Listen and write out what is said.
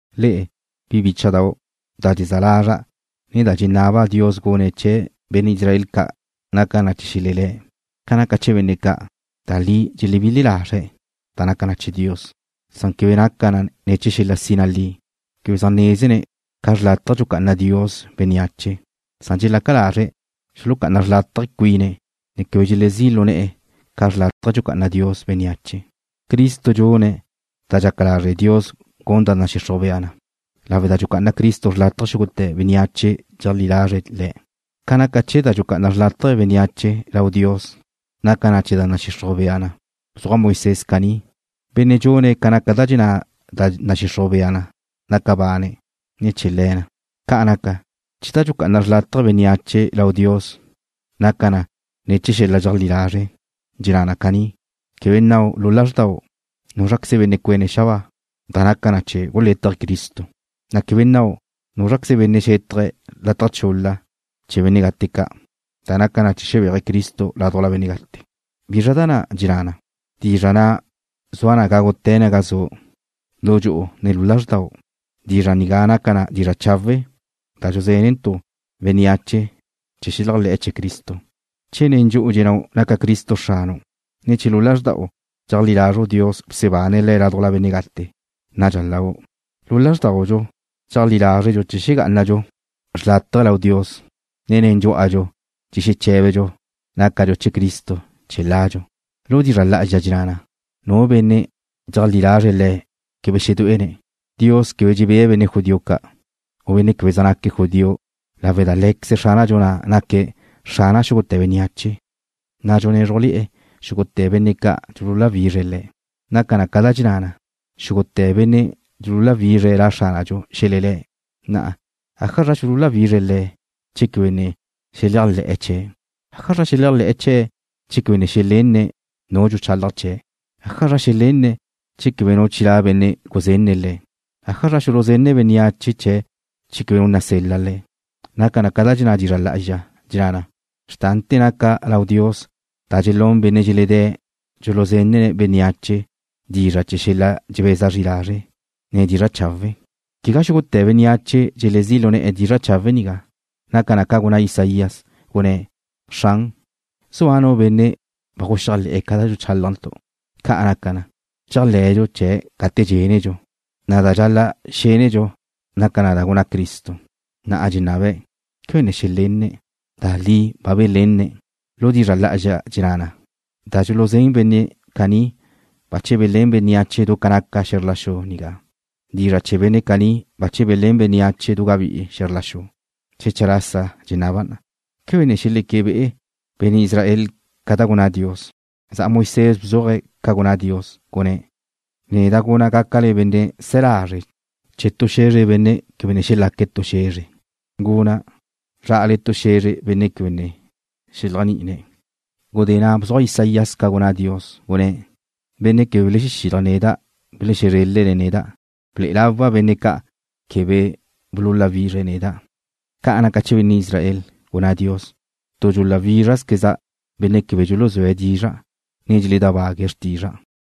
Le'e, bi bícha'dau', da dxezá lazra', ne da dxenaba' Dios gune̱' chee̱ benne' Israel ca' naca na chee̱ xelelé̱'. Ca naca chee̱ benne' ca', da li dxelebile lazre̱' da naca chee̱ Dios, san quebe naca na chee̱ xel-la sina li. Quebe zaj nézene̱' ca xrlátaje dxucá'ana Dios bénneache, san dxelaca lazre̱' xulucá'ana xrlátaje cuine̱', ne quebe dxelezí' lu ne̱'e̱ ca xrlátaje dxucá'ana Dios bénneache. Cristo dxune̱' da dxaca lazre' Dios gun da nadxixruj bea na, lawe' da dxucá'ana Cristo xrlátaje xúgute̱ bénneache dxeleajlí lazre̱' Le̱'. Ca naca chee̱ da dxucá'ana xrlátaje bénneache lau Dios da naca na ne̱ chee̱ da nadxixruj bea na, bzuaj Moisés caní: Benne' dxune̱' ca naca da dxenná da nadxixruj bea na gaca bane̱' ne̱ chee̱ le̱ na. Ca naca chee̱ da dxucá'ana xrlátaje bénneache lau Dios da naca na ne̱ chee̱ xel-la dxeajlí lazre' dxenná na caní: Quebe nnau' lu lazrda'u: “¿Núzraqueze benne' cuéne̱' xabáa?” (da naca na chee̱ gulétaje̱' Cristo), ne quebe nnau': “¿Núzraqueze benne' xétaje̱' lataj chul-la chee̱ benne' gate ca'?” (da naca na chee̱ xebéaje̱' Cristo ládujla benne' gate.) ¿Bizra da na' dxenná na: Dizra' na' zua na gágute̱ naga zu', lu dxu'u ne lu lazrda'u? Dizra' nigá naca na dizra' chawe' da dxuzénentu' bénneache chee̱ xeléajle̱'e̱ chee̱ Cristo. Che nen dxu'u dxennáu' naca Cristo Xranu', ne che lu lazrda'u dxeajlí lazru' Dios bsebane̱' Le̱' ládujla benne' gate, nadxa lau'. Lu lázrdaudxu dxeajlí lázredxu chee̱ xegá'anadxu xrlátaje lau Dios, ne nen dxú'adxu dxexeché̱bedxu nácadxu chee̱ Cristo chee̱ ladxu. Lu dizra' lá'azxa dxenná na: Nu benne' dxeajlí lazre̱' Le̱' quebe xedué'ene̱'. Dios quebe dxebée̱' benne' judío ca', u benne' quebe zaj naque̱' judío lawe' da Lé̱queze Xránadxu na' naque̱' Xrana xúgute̱ bénneache, na' dxunézrujle̱'e̱ xúgute̱ benne' ca' dxululáwizre̱' Le̱'. Naca na ca da dxenná na: Xúgute̱ benne' dxululáwizre̱' La Xránadxu xelelé̱'. Na'a ¿ájazra xululáwizre̱' Le̱' che quebe ne xeléajle̱'e̱ chee̱'? ¿Ájazra xeléajle̱'e̱ chee̱' che quebe ne xelenne̱' nu dxuchalaj chee̱'? ¿Ájazra xelenne̱' che quebe nu chilá' benne' guzenne̱' le̱'? ¿Ájazra xuluzenne̱' bénneache che quebe nu nasel-la le̱'? Naca na ca dxenná dizra' lá'azxa, dxenná na: Xrtante̱ naca lau Dios da dxelún benne' dxeledé̱' dxuluzenne̱' bénneache dizra' chee̱ xel-la dxebeza zri lazre', ne dizra' chawe'. Quegá xúgute̱ bénneache dxelezí' lu ne̱'e̱ dizra' chawe' nigá. Naca na ca gunná Isaías, gunné̱': “Xran, ¿zua nu benne' ba guxéajle̱'e̱ ca da dxuchálajntu'?” Ca' naca na, dxéajle̱dxu chee̱' gate dxénedxu, na' da dxal-la' xénedxu naca na da gunná Cristo. Na'a dxenaba': ¿Quebe ne xelenne̱'? Da li ba belenne̱'. Lu dizra' lá'azxa dxenná na: Da dxuluzén benne' caní bache belén bénneache du ca naca xe̱zr la xu nigá. Dizra' chee̱ benne' caní bache belén bénneache du gabí'i xe̱zr la xu. Xecha lasa dxenaba': ¿Quebe ne xeleque be'e benne' Israel ca da gunná Dios? Za'a Moisés bzuaje̱' ca gunná Dios, gunné̱': Neda' guna' gácale benne' se̱ lazre' chee̱ tu xe̱zre benne' quebe ne xelaque̱' tu xe̱zre. Guna' zrá'ale tu xe̱zre benne' quebe ne xeléajni'ine̱'. Gudé na' bzuaj Isaías ca gunná Dios, gunné̱': Benne' quebe belexílaje̱' neda' belexezrélene̱' neda'. Ble'e lawa' benne' ca' quebe bululáwizre̱' neda'. Ca naca chee̱ benne' Israel, gunná Dios: “Tu dxuláwizrazqueza' benne' quebe dxuluzúe̱' dizra', ne dxeledábague̱' xrtizra'.”